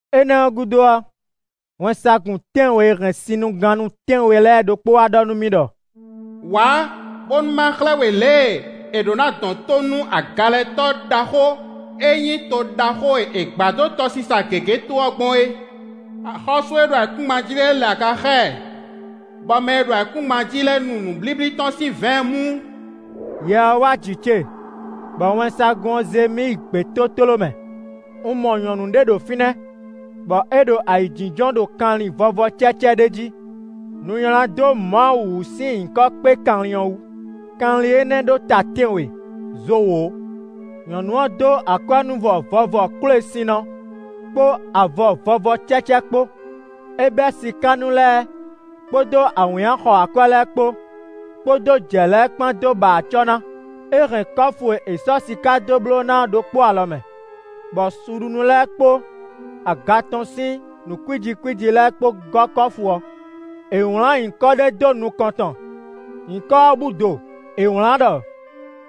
Énɛ́ ɔ́ gúdo ɔ́, wɛnsagun tɛ́nwe e hɛn sinnugannú tɛ́nwe lɛ́ɛ ɖokpó wá ɖɔ nú mì ɖɔ: “Wǎ, bónú ma xlɛ́ we lě e è ɖǒ ná dɔn tó nú agalɛtɔ́ ɖaxó e nyí toxo ɖaxó e è gbǎ ɖó tɔsisa gěgé tó ɔ́ gbɔn é. Axɔ́sú e ɖo ayǐkúngban jí lɛ́ɛ lɛ aga xá ɛ, bɔ mɛ e ɖo ayǐkúngban jí lɛ́ɛ nu nǔblíblí tɔn sín vɛ̌ɛn mú.” Yɛ ɔ́ wá jǐ ce, bɔ wɛnsagun ɔ́ zé mì yi gbětótló mɛ. Un mɔ nyɔ̌nu ɖé ɖo fínɛ́, bɔ é ɖo ayǐjínjɔ́n ɖo kanlin vɔvɔ cɛ́cɛ́ ɖé jí; nu nylá dó Mawu wǔ sín nyǐkɔ kpé kanlin ɔ́ wú; kanlin énɛ́ ɖó ta tɛ́nwe, zo wǒ. Nyɔ̌nu ɔ́ dó akwɛ́núvɔ vɔvɔ kwélesinnɔ kpó avɔ vɔvɔ cɛ́cɛ́ kpó; é bɛ́ sikánú lɛ́ɛ kpódó awǐnnya xɔ akwɛ́ lɛ́ɛ kpó, kpódó jɛ̌ lɛ́ɛ kpán dó ba acɔ́ ná; é hɛn kɔ́fu e è sɔ́ siká dó bló ná ɔ́ ɖokpó alɔ mɛ, bɔ suɖunú lɛ́ɛ kpó aga tɔn sín nǔ kwíji kwíji lɛ́ɛ kpó gɔ́ kɔ́fu ɔ́. È wlǎn nyǐkɔ ɖé dó nukɔn tɔn; nyǐkɔ ɔ́ búdo. È wlǎn ɖɔ: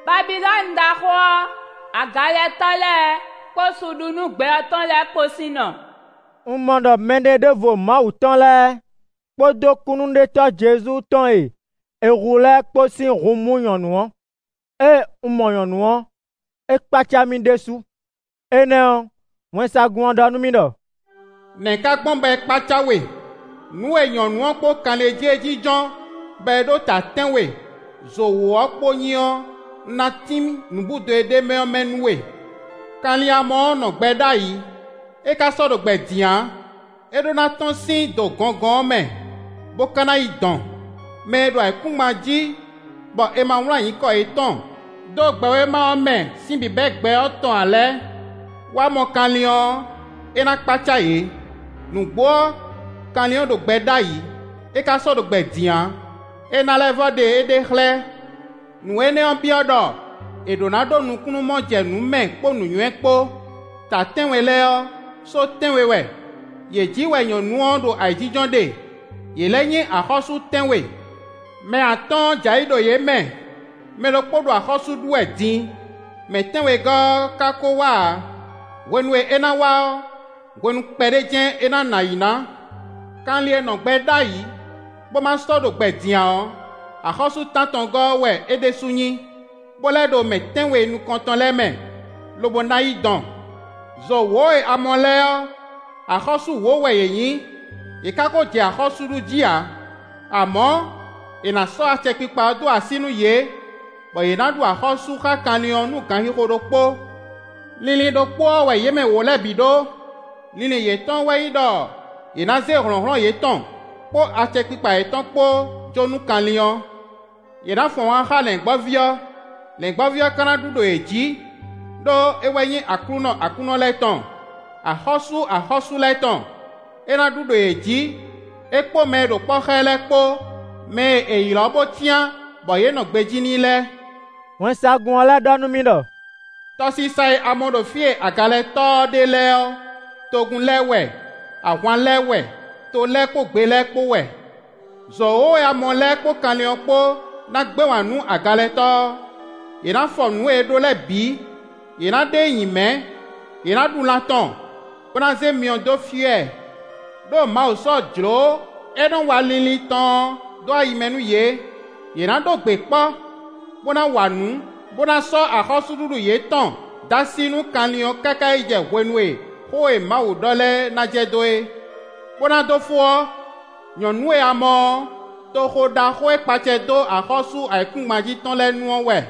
“Babilɔ́nu ɖaxó ɔ́, agalɛtɔ́ lɛ́ɛ kpó suɖunú gbɛ ɔ́ tɔn lɛ́ɛ kpó sín nɔ.” Un mɔ ɖɔ mɛɖeɖóvo Mawu tɔn lɛ́ɛ kpódó kúnnuɖetɔ́ Jezu tɔn e è hu lɛ́ɛ kpó sín hun mú nyɔ̌nu ɔ́. Ée un mɔ nyɔ̌nu ɔ́, é kpácá mì ɖésú. Énɛ́ ɔ́, wɛnsagun ɔ́ ɖɔ nú mì ɖɔ: “Nɛ̌ ka gbɔn bɔ é kpácá we? Nǔ e nyɔ̌nu ɔ́ kpó kanlin e jí é jínjɔ́n, bɔ é ɖó ta tɛ́nwe, zo wǒ ɔ́ kpó nyí ɔ́, un ná tín nǔbúdo e ɖ'é mɛ ɔ́ mɛ nú we. Kanlin e a mɔ ɔ́ nɔ gbɛ ɖ'ayǐ; é ka sɔ́ ɖo gbɛ din ǎ; é ɖó ná tɔ́n sín do gɔngɔn ɔ́ mɛ, bó ka ná yi dɔn. Mɛ e ɖo ayǐkúngban jí bɔ è ma wlán nyǐkɔ yětɔn dó gbɛwéma ɔ́ mɛ sín bǐbɛ́mɛ gbɛ ɔ́ tɔn ǎ lɛ́ɛ wá mɔ kanlin ɔ́, é ná kpácá yě: nǔgbó ɔ́, kanlin ɔ́ ɖo gbɛ ɖ'ayǐ; é ka sɔ́ ɖo gbɛ din ǎ, é ná lɛ́ vɔ́ ɖe éɖée xlɛ́. “Nǔ énɛ́ ɔ́ byɔ́ ɖɔ è ɖǒ ná ɖó nukúnnú mɔ jɛ nǔ mɛ kpó nǔnywɛ́ kpó. Ta tɛ́nwe lɛ́ɛ ɔ́, só tɛ́nwe wɛ; yě jí wɛ nyɔ̌nu ɔ́ ɖo ayǐjínjɔ́n ɖe; yě lɛ́ nyí axɔ́sú tɛ́nwe. Mɛ atɔ́ɔ́n jɛ ayǐ ɖo yě mɛ; mɛ ɖokpó ɖo axɔ́sú ɖu wɛ din; mɛ tɛ́nwegɔ́ ɔ́ ka ko wá ǎ; hwenu e é ná wá ɔ́, hwenu kpɛɖé jɛ́n é ná nɔ ayǐ ná. Kanlin e nɔ gbɛ ɖ'ayǐ, bó ma sɔ́ ɖo gbɛ din ǎ ɔ́, axɔ́sú tántɔngɔ́ ɔ́ wɛ é ɖésú nyí, bó lɛ́ ɖo mɛ tɛ́nwe nukɔntɔn lɛ́ɛ mɛ, lobo ná yi dɔn. “Zo wǒ e a mɔ lɛ́ɛ ɔ́, axɔ́sú wǒ wɛ yě nyí; yě ka ko jɛ axɔ́sú ɖu jí ǎ. Amɔ̌ è nǎ sɔ́ acɛkpikpa ɔ́ dó así nú yě, bɔ yě ná ɖu axɔ́sú xá kanlin ɔ́ nú ganxixo ɖokpó. Linlin ɖokpó ɔ́ wɛ yě mɛ wǒ lɛ́ɛ bǐ ɖó; linlin yětɔn wɛ nyí ɖɔ yě ná zé hlɔ̌nhlɔ́n yětɔn kpó acɛkpikpa yětɔn kpó jó nú kanlin ɔ́. Yě ná fun ahwan xá Lɛ̌ngbɔ́ví ɔ́. Lɛ̌ngbɔ́ví ɔ́ ka ná ɖu ɖo yě jǐ; ɖó é wɛ nyí Aklúnɔ aklúnɔ lɛ́ɛ tɔn; Axɔ́sú axɔ́sú lɛ́ɛ tɔn; é ná ɖu ɖo yě jǐ, é kpó mɛ e ɖo kpɔ́ xá ɛ lɛ́ɛ kpó; mɛ e è ylɔ̌ bó cyán bɔ yě nɔ gbejí n'i lɛ́ɛ.” Wɛnsagun ɔ́ lɛ́ ɖɔ nú mì ɖɔ: “Tɔsisa e a mɔ ɖo fí e agalɛtɔ́ ɔ́ ɖe lɛ́ɛ ɔ́, togun lɛ́ɛ wɛ; ahwan lɛ́ɛ wɛ; to lɛ́ɛ kpó gbe lɛ́ɛ kpó wɛ. Zo wǒ e a mɔ lɛ́ɛ kpó kanlin ɔ́ kpó ná gbɛ́ wǎn nú agalɛtɔ́ ɔ́; yě ná fɔ nǔ e é ɖó lɛ́ɛ bǐ; yě ná ɖe e nyi mɛ̌; yě ná ɖu lan tɔn, bó ná zé myɔ dó fyɔ́ ɛ. Đó Mawu sɔ́ jlǒ e nɔ wa linlin tɔn ɔ́ dó ayi mɛ nú yě; yě ná ɖó gbe kpɔ́, bó wa nǔ, bó ná sɔ́ axɔ́súɖuɖu yětɔn dó así nú kanlin ɔ́ káká yi jɛ hwenu e xó e Mawu ɖɔ lɛ́ɛ ná jɛ dó é. “Bó ná dó fó ɔ́, nyɔ̌nu e a mɔ ɔ́, toxo ɖaxó e kpa acɛ dó axɔ́sú ayǐkúngban jí tɔn lɛ́ɛ nu ɔ́ wɛ.”